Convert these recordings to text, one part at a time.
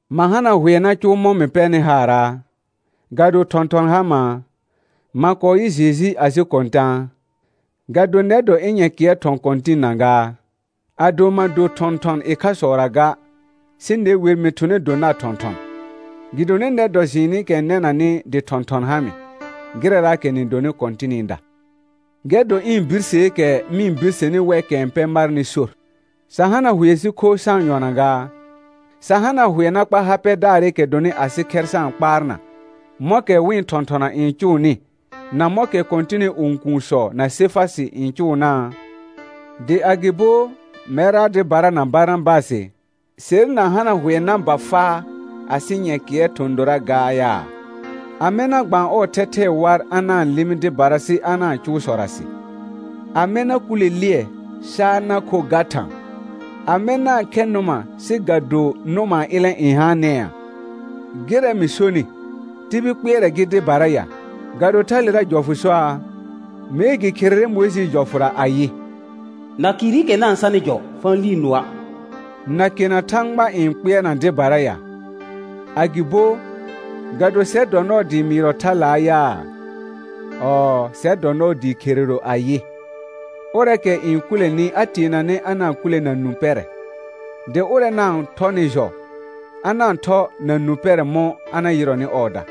Ma hana hʋɛ na cʋʋ mɔ̃ mɩ pɛrnɩ haaraa? Ga do thɔ̃thɔn ha maa? Ma kɔɔ yɩ Jeju asɩ Kɔ̃tãa? Ga do nɛr dɔ ɩ̃ nyɛ̃kɩɛr thɔ̃ Kɔ̃tɩnna gaa? Ado ma do thɔ̃thɔn ɩkhasɔra ga, sɩ ne wer mɩ thʋnɛ do nar thɔ̃thɔn, gɩdonɩ nɛr dɔ jɩɩnɩkɛ n nɛnanɩ dɩ thɔ̃thɔn ha mɩ, gɩrɛraakɛ nɩ donɩ Kɔ̃tɩnɩda. Gɛr dɔ ɩ̃ birseekɛ mɩ-n birseni wɛkɛ n pɛ marnɩ sor. Sa hana hʋɛ sɩ kho sa-n yɔna gaa? Sa hana hʋɛ na kpa ha pɛdaarɩkɛ dɔnɩ asɩ khɛr sa-n kpaarna, mɔ̃kɛ wɩ̃ thɔ̃thɔna n cʋʋnɩ, na mɔ̃kɛ Kɔ̃tɩnɩ õkuunsɔ na Sefasɩ n cʋʋnaa? Dɩ agɩbo mɛrra dɩbara na Barnabasɩ, ser na hana hʋɛ na ba faa asɩ nyɛ̃kɩɛr thɔ̃ dora gaa yaa? Amɛ na gbaan ɔɔ thɛthɛɛ war a na-n lɩmɩ dɩbara sɩ a na-n cʋʋ sɔrasɩ? Amɛ na kʋlɛ lɩɛ sa a na kho ga thã? Amɛ na-n khɛ nʋma sɩ ga do nʋmaa ilẽ n haanɛa? Gɩrɛ mɩ sonɩ, tibil kpɩɛrɛ gɩ dɩbara ya? Ga do thalera jɔfʋ soaa? Mee gɩ kherere Mʋɩjɩɩ jɔfʋra ayɩ: «Nakɩɩrɩkɛ na-n sanɩ jɔ, fa-n lii nʋɔa'.» Nakena Thãgba n kpɩɛrna dɩbara ya? Agɩbo, ga do sɛr dɔ nɔɔ dɩɩ mɩɩrɔ thalaa yaa? Ɔɔ, sɛr dɔ nɔɔ dɩɩ kherero ayɩ: Ʋrɛɛkɛ n kʋlɛnɩ a teenanɛ a na-n kʋlɛ na nũ pɛrɛ, dɩ ʋrɛ na-n thɔnɩ jɔ, a na-n thɔ na nũ pɛrɛ mɔ̃ a na yɩrɔnɩ ɔɔda.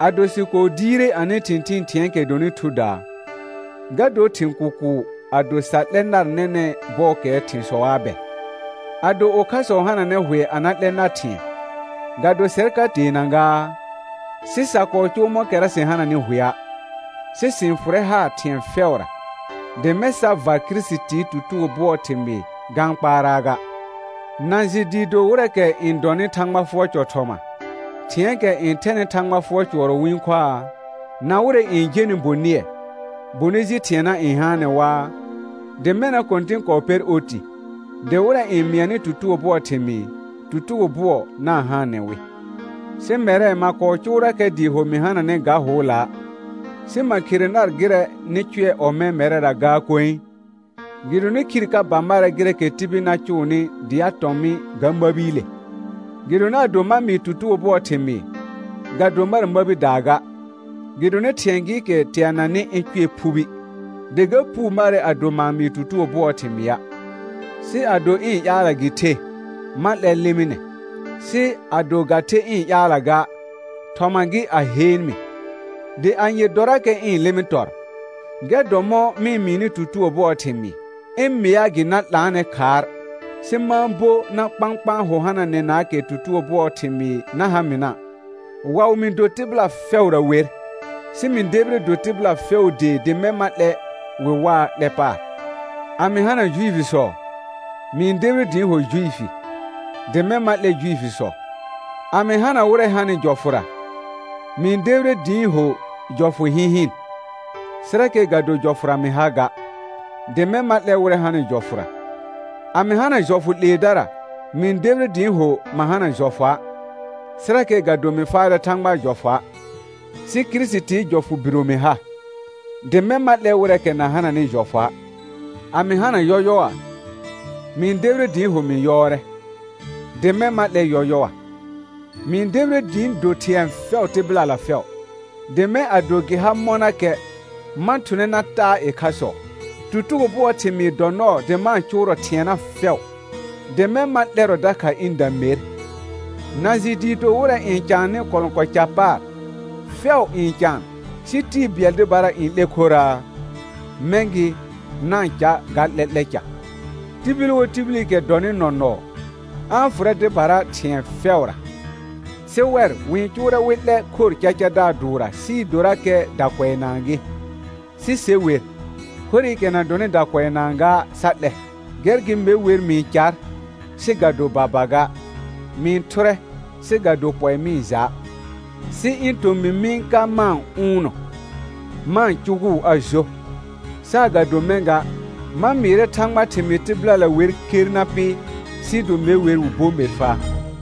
Ado sɩ kɔɔ diire anɩ thɩ̃thɩɩn thɩ̃ɛɛkɛ dɔnɩ thudaa, ga dor thɩ̃ kʋkʋʋ ado sa 'lɛ nar nɛnɛ̃ bɔɔkɛɛ thɩ̃sɔa bɛ? Ado ʋkhasɔ hananɛ hʋɛ a na 'lɛ nar thɩ̃ɛ, ga do sɛr ka teena gaa? Sɩ sa kɔɔ cʋʋ mɔ̃kɛra sɩ hananɩ hʋɛa', sɩ sɩ-n fʋrɛ haar thɩ̃ɛ fɛʋra, dɩ mɛ̃ sa var Kirisitii tutugo bʋɔɔ thɩmɩɩ ga-n kpaaraa ga. Na jɩ dɩɩ do wɩrɛɛkɛ n dɔnɩ Thãgba fʋɔr cɔ thɔma, thɩ̃ɛɛkɛ n thɛnɩ Thãgba fʋɔr cʋɔrɔ wɩ-n khoaa? Na wɩrɛ n jenɩ bonɩɛ, bonɩ ji thɩɛna n haanɛ waa? Dɩ mɛna Kɔ̃tɩn kɔɔ pɛr oti, dɩ wɩrɛ n mɩanɩ tutugo bʋɔɔ thɩmɩɩ, tutugo bʋɔ na-n haanɛ wɩ. Sɩ mɛrɛ ma kɔɔ cʋʋrakɛ dɩɩ ho mɩ hananɛ ga hʋʋla'. Sɩ ma khere nar gɩrɛ nɩ cʋɛ ɔmɛ̃ mɛrɛra gaa koe, gɩdonɩ khir ka ba marɛ gɩrɛɛkɛ tibil na cʋʋnɩ dɩ a tɔ̃ mɩ ga məbiile. Gɩdonɩ ado ma mɩɩ tutugo bʋɔɔ thɩmɩɩ, ga do mar məbidaa ga; gɩdonɩ thɩ̃ɛ gɩɩkɛ teananɩ ɩ̃ cʋɛ phubi, dɩ ga puu marɛ ado ma-n mɩɩ tutugo bʋɔɔ thɩmɩa'. Sɩ ado ɩ̃ ƴaalla gɩ the, ma 'lɛr lɩmɩnɛ; sɩ ado ga the ɩ̃ ƴaalla ga, thɔma gɩ a heen mɩ. Dɩ anye dɔrakɛ ɩ̃ lɩmɩ tɔr? Gɛr dɔ mɔ̃ mɩ-n mɩɩnɩ tutugo bʋɔɔ thɩmɩɩ, ɩ̃ mɩa gɩ na 'laanɛ khaar, sɩ ma-n bo na kpãkpãa hʋ hananɛnaakɛ tutugo bʋɔɔ thɩmɩɩ na ha mɩna'. Waʋ mɩ do tɩbɩla fɛʋra wer, sɩ mɩ debire do tɩbɩla fɛʋʋ dee dɩ mɛ̃ ma 'lɛ wɩ waa 'lɛ paar. A mɩ hana Juifisɔ, mɩ-n debire dɩ ɩ̃ ho Juifi, dɩ mɛ̃ ma 'lɛ Juifisɔ. A mɩ hana wɩrɛ hanɩ jɔfʋra, mɩ-n debire dɩ ɩ̃ ho jɔfʋ hɩ̃hɩn, sɩrakɛ ga do jɔfʋra mɩ ha ga, dɩ mɛ̃ ma 'lɛ wɩrɛ hanɩ jɔfʋra. A mɩ hana jɔfʋ 'leedara, mɩ-n debire dɩ ɩ̃ ho ma hana jɔfʋa', sɩrakɛ ga do mɩ faarɛ Thãgbaa jɔfʋa', sɩ Kirisitn jɔfʋ biro mɩ ha, dɩ mɛ̃ ma 'lɛ wɩrɛɛkɛ na hananɩ jɔfʋa'. A mɩ hana yɔyɔa, mɩ-n debire dɩ ɩ̃ ho mɩ yɔɔrɛ, dɩ mɛ̃ ma 'lɛ yɔyɔa; mɩ-n debire dɩ ɩ̃ do thɩ̃ɛ fɛʋ tɩbɩlala fɛʋ, dɩ mɛ̃ ado gɩ ha mɔnakɛ, ma thʋnɛ na taa ɩkhasɔ. Tutugo bʋɔɔ thɩmɩɩ dɔ nɔɔ dɩ ma-n cʋʋrɔ thɩɛna fɛʋ, dɩ mɛ̃ ma 'lɛrɔ dakha ɩ̃da mer. Na jɩ dɩɩ do wɩrɛ n caannɩ kɔlɔ̃kɔɔ ca paar, fɛʋ n caan, sɩ tɩɩ bɩɛl dɩbara n 'lɛ khoraa? Mɛ̃ gɩ, na-n ca ga 'lɛ'lɛ ca. Tibil wo tibilikɛ dɔnɩ nɔnɔɔ, a-n fʋrɛ dɩbara thɩ̃ɛ fɛʋra; sɩ wɛr wɩ-n cʋʋrɛ wɩ 'lɛ khor cacadaar dʋʋrra sɩɩ dorakɛ dakʋɛnaa gɩ, sɩ se wer, khorɩkɛ na dɔnɩ dakʋɛnaa ga sa 'lɛ. Gɛr gɩ me wer mɩ-n car, sɩ ga do baba ga, mɩ-n thʋrɛ, sɩ ga do pɔɩ mɩ-n ja'; sɩ ɩ̃ tomɩ mɩ-n ka ma-n ʋʋnnɔ, ma-n cʋgʋʋ a jo, saagado mɛ̃ ga, ma mɩɩrɛ Thãgbaa thɩmɩɩ tɩbɩlala wer ker na pɩ, sɩɩ do me wer wɩ bo mer faa.